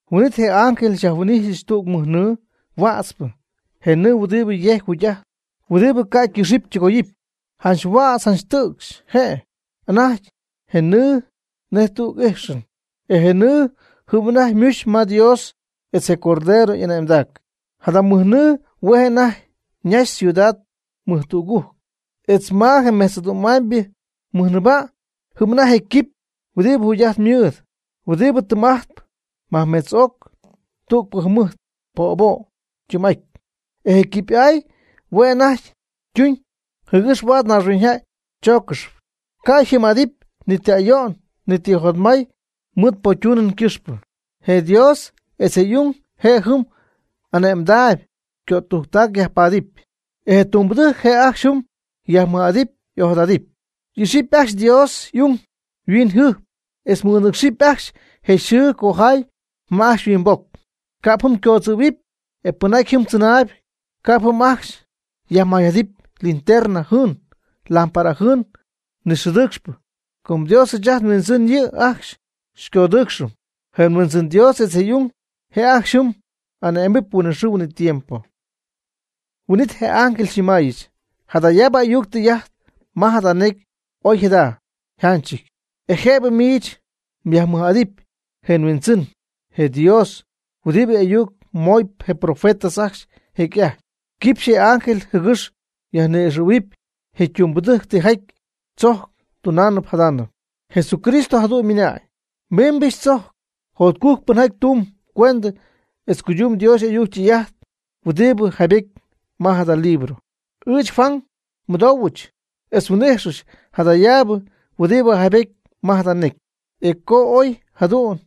Huin'it je ángel xyajni'ixɨɨyɨch tüg mɨjnɨɨ huätzpɨ, je nɨɨ huɨdibɨ yejcp jugy'ajt huɨdibɨ ca' ycɨxɨp ytɨgoyɨp. Janch huädz janch tɨɨcx je' anajty je nɨɨ nej tüg ijxɨn. E je nɨɨ jɨm anajty ymuxy ma Dios etz je Cordero y'ane'mdac. Jada mɨj nɨɨ hue' je' anajty ñaxy cuidad mɨjtügujc, etz ma je mejtz'adu'm'amybɨ mɨjnɨɨba', jɨm anajty je quipy huɨdibɨ jugy'ajt mɨɨd, huɨdibɨ tɨɨm'ajt majmetz'oc tügpɨ jɨmɨjt, po' po' ytɨɨm'aty, e je quipy y'aay hue' anajty ytuñ jɨgɨx huaad naaxhuiñyjäy chooccɨxy. Ca'p jɨm y'adɨpy ni ti ayo'n ni ti jotmay mɨɨd pocytunɨɨ ycɨxpɨ. Je Dios etz je' y'ung je' jɨm y'ane'mdac ycötujctac yajpaadɨpy. E je' ytumbɨdɨjc je' ajcxy jɨm yajmɨj'adɨɨb ojadadɨɨb. Y'ijxɨpy ajcxy je Dios y'ung yhuiñyjɨjp etz ymɨnɨcxɨp ajcxy je' yxɨɨ ycojay ma ajcxy yhuimboc. Ca'p jɨm ycootzɨ̈huɨty. E pɨnjaty jɨm tzɨnaayb ca'p ajcxy yajmayjadɨpy linterna jɨɨn, lamparajɨɨn, ni xɨɨdɨɨcxpɨ, com Dios ɨɨch ajt nHuindzɨn yɨ' yɨ' ajcxy codɨɨcxɨɨb. Je Huindzɨn Dios etz je' y'ung je' ajcxy jɨm ane'mɨp huinɨxɨɨ huinɨtiempo. Huin'it je ángel xyñɨmaayɨch: ―Jadayaabɨ ayuc tɨy'ajt ma jada necy, ooy jada yjanchɨty, e jëbɨ miich myajmɨj'adɨpy. Je Huindzɨn, je Dios huɨdibɨ ayuc moy je profetas ajcxy jecy'ajty, quejxy y'ángel jɨgɨx yajni'ixɨ̈huɨpy je' ytumbɨdɨjc tijaty tzojc tunaanɨp jadaanɨp. Jesucristo jadu'n ymɨnañ: ―¡Miimbɨch tzojc! Jotcujc pɨnjaty tumb cuendɨ etz cuydumb Dios y'ayuc ytɨy'ajt huɨdibɨ jaybetyɨp ma jada libro. Ɨɨch Juan, nmɨdoohuɨch etz nhuin'ijxɨch jadayaabɨ huɨdibɨ jaybety ma jada necy. E co oy jadu'n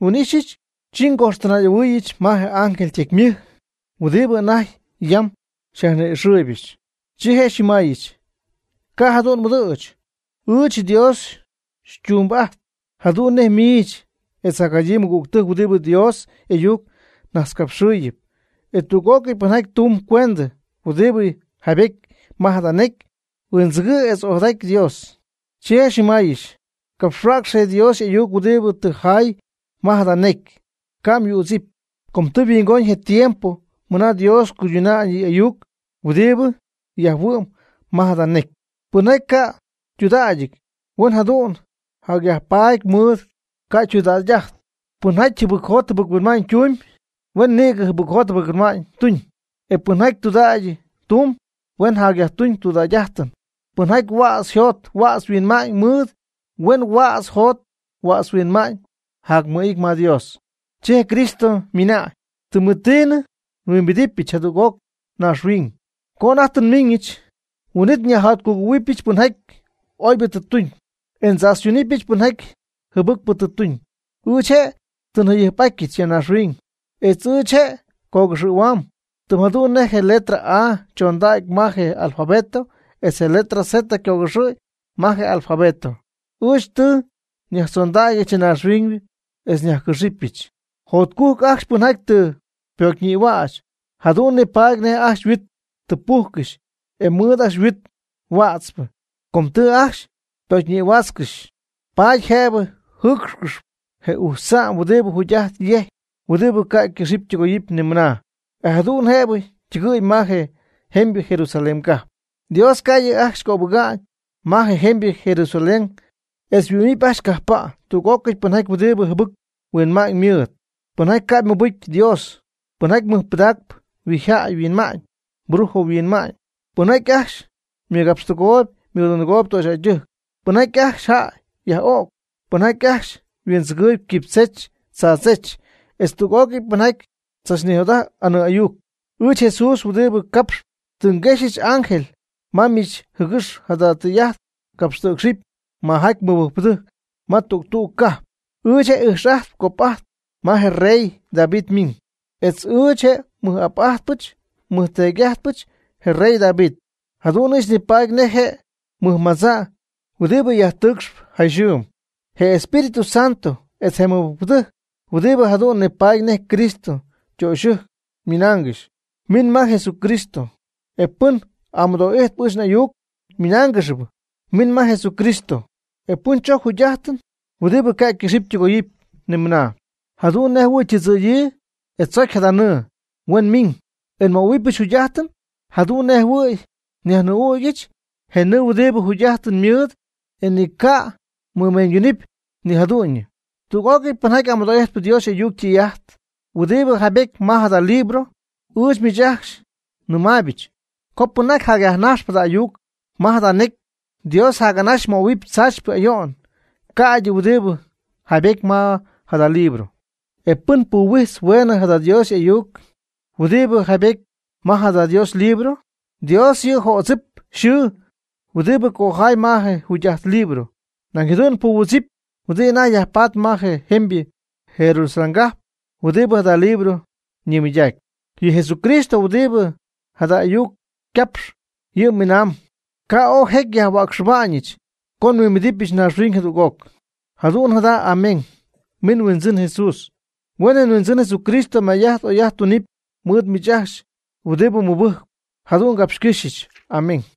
nhuin'ixyɨch, chi nhuɨjoj'ɨhuɨɨyɨch ma je ángel ytecymɨjc huɨdibɨ anajty yam xyajni'ixɨɨybɨch. Chi je' xyñɨmaayɨch: ―Ca' jadu'n m'ɨdɨ̈ch. Ɨɨch, Dios xytumbɨ'ajtp jadu'n nej miich etz jacjadyii mɨgügtɨjc huɨdibɨ Dios y'ayuc najtzcapxɨɨyɨp, e tüg'ócɨy pɨnjaty tumb cuendɨ huɨdibɨ jaybetyɨp ma jada necy. Huindzɨgɨ' etz ojadat Dios. Chi je' xyñɨmaayɨch: ―Capxhuäcxɨ je Dios y'ayuc huɨdibɨ tɨ mjay ma jada necy, ca' myüdzɨp. Com tɨ yhuingoñ je tiempo mɨna Dios cuyduna'ñ yɨ y'ayuc huɨdibɨ yjayhuɨ'm ma jada necy. Pɨnjaty ca' ytudägyɨty, huen jadu'n jacyajpaady mɨɨd ycatudägy'ajt. Pɨnjaty jɨbɨcjot jɨbɨc-huinma'ñ tumb, huen nïgɨ jɨbɨcjot jɨbɨc-huinma'ñ tuñ. E pɨnjaty tudägyɨ tumb, huen jactuñ tudägy'ajtɨn. Pɨnjaty huädz yjot huädz yhuinma'ñ mɨɨd, huen huädz yjot huädz yhuinma'ñ jacmɨ'ity ma Dios. Chi je Cristo ymɨnañ: ―Tɨmetiinɨ nhuimbidɨpyɨch jadüg'oc naaxhuiñ. Co anajty tɨ nmiiñɨch, huin'it nyajjotcugɨ̈huɨbɨch pɨnjaty oybɨ tɨ tuñ, e ndzaachytunɨpyɨch pɨnjaty jɨbɨcpɨ tɨ tuñ. Ɨɨch je' tɨ njayɨjp'atyɨch ya naaxhuiñ, etz ɨɨch je' cogɨxɨ̈huamb, tɨm jadu'n nej je letra A chondägy ma je alfabeto etz je letra Z ycogɨxɨ̈y ma je alfabeto. Ɨɨch tɨ nyajtzondacyɨch je naaxhuiñ etz nyajcɨxɨpyɨch. Jotcujc ajcxy pɨnjaty tɨ ypocyñïhuäch, jadu'n nipaady nej ajcxy yhuit tɨ pujcɨxy e mɨɨd ajcxy yhuit huätzpɨ. Com tɨ ajcxy ypocyñïhuaatzcɨxy, paady jëbɨ jɨ́ɨcxcɨxɨp je ujtz tza'm huɨdibɨ jugy'ajt yejcpy huɨdibɨ ca' ycɨxɨpy ytɨgoyɨpy ni mɨna, e jadu'n jëbɨ ytɨgɨ̈y ma je jemybɨ Jerusaléngajp. Dios ca' yɨ' ajcxy cöbɨga'ñ ma je jemybɨ Jerusalén etz huɨ'mɨp ajcxy cajppa' tüg'ócɨy pɨnjaty huɨdibɨ jɨbɨc-huinma'ñ mɨɨd, pɨnjaty ca' mɨbɨcy Dios, pɨnjaty mɨjpɨdacp huijyjäy yhuinma'ñ brujo yhuinma'ñ, pɨnjaty ajcxy mɨgapxtɨgooyb mɨdundɨgooyb töxyjäydɨjc, pɨnjaty ajcxy jäy yaj'öcp, pɨnjaty ajcxy huindzɨgɨɨyb quipychech tzaachech, etz tüg'ócɨy pɨnjaty tzachnixondacp anɨɨ ayuc. Ɨɨch Jesús huɨdibɨ capxp. Tɨ nguexyɨch n'ángel ma miich jɨgɨx jada tɨy'ajt capxtɨ̈cxɨpy majaty mɨbɨjcpɨdɨjc ma tüg tüg cajp. Ɨɨch je' ijx'ajtp cop'ajtp ma je rey David miiñ. Etz ɨɨch je' nmɨj'ap'ajtpyɨch nmɨjteedy'ajtpyɨch je rey David. Jadu'n ɨɨch nipaady nej je mɨjmadza' huɨdibɨ yajtijp jayxɨɨm. Je Espíritu Santo etz je mɨbɨjcpɨdɨjc huɨdibɨ jadu'n nipatp nej Cristo ytöxyɨjc ymɨnaangɨxy: ―Min ma Jesucristo. E pɨn amɨdoo'ijtp ɨɨch n'ayuc ymɨnáangɨxɨpy: ―Min ma Jesucristo. E pɨn tzojcp jugy'ajtɨn huɨdibɨ ca' ycɨxɨpy ytɨgoyɨpy nimɨna, jadu'n nej jɨhuɨ̈y ytɨdzɨ̈yii e tzocy jada nɨɨ, huen miiñ, e nmöhuɨbyɨch jugy'ajtɨn, jadu'n nej jɨhuɨ̈y nyajnɨɨ'ügɨch je nɨɨ huɨdibɨ jugy'ajtɨn mɨɨd e ni ca' mɨmeeñydunɨpy ni jadu'ñyɨ. Tüg'ócɨy pɨnjaty amɨdoo'ijtp Dios y'ayuc ytɨy'ajt huɨdibɨ jaybetyɨp ma jada libro, ɨɨch miich ajcxy nɨmaaybɨch co pɨnjaty jacyaj'anajxp jada ayuc ma jada necy, Dios jac'anaxy möhuɨɨb tzaachypɨ ayo'n, ca'ydɨ huɨdi jaybetyɨp ma jada libro. E pɨn puuhuijtzp hueenɨ jada Dios y'ayuc huɨdibɨ jaybetyɨp ma jada Dios ylibro, Dios yɨ' jötzɨɨb yxɨɨ huɨdi cojaayɨp ma je jugy'ajt libro. Nañ jadu'n ypuhuidzɨɨyb huɨdi anajty japaatɨp ma je jemybɨ Jerusaléngajp, huɨdi jada libro ñimɨydacpy. Yɨ Jesucristo huɨdibɨ jada ayuc capxp, yɨ' mɨnamb: ―Ca' ooy jecy njac-huäcxɨba'ñɨch co nhuimbidɨpyɨch naaxhuiñ jadüg'oc. Jadu'n jada. Amén. ¡Min, Huindzɨn Jesús! Huen je nHuindzɨn Jesucristo may'ajt oy'ajt tunɨpy mɨɨd miich ajcxy huɨdibɨ mɨbɨjcp. Jadu'n ngapxycɨ́xyɨch. Amén.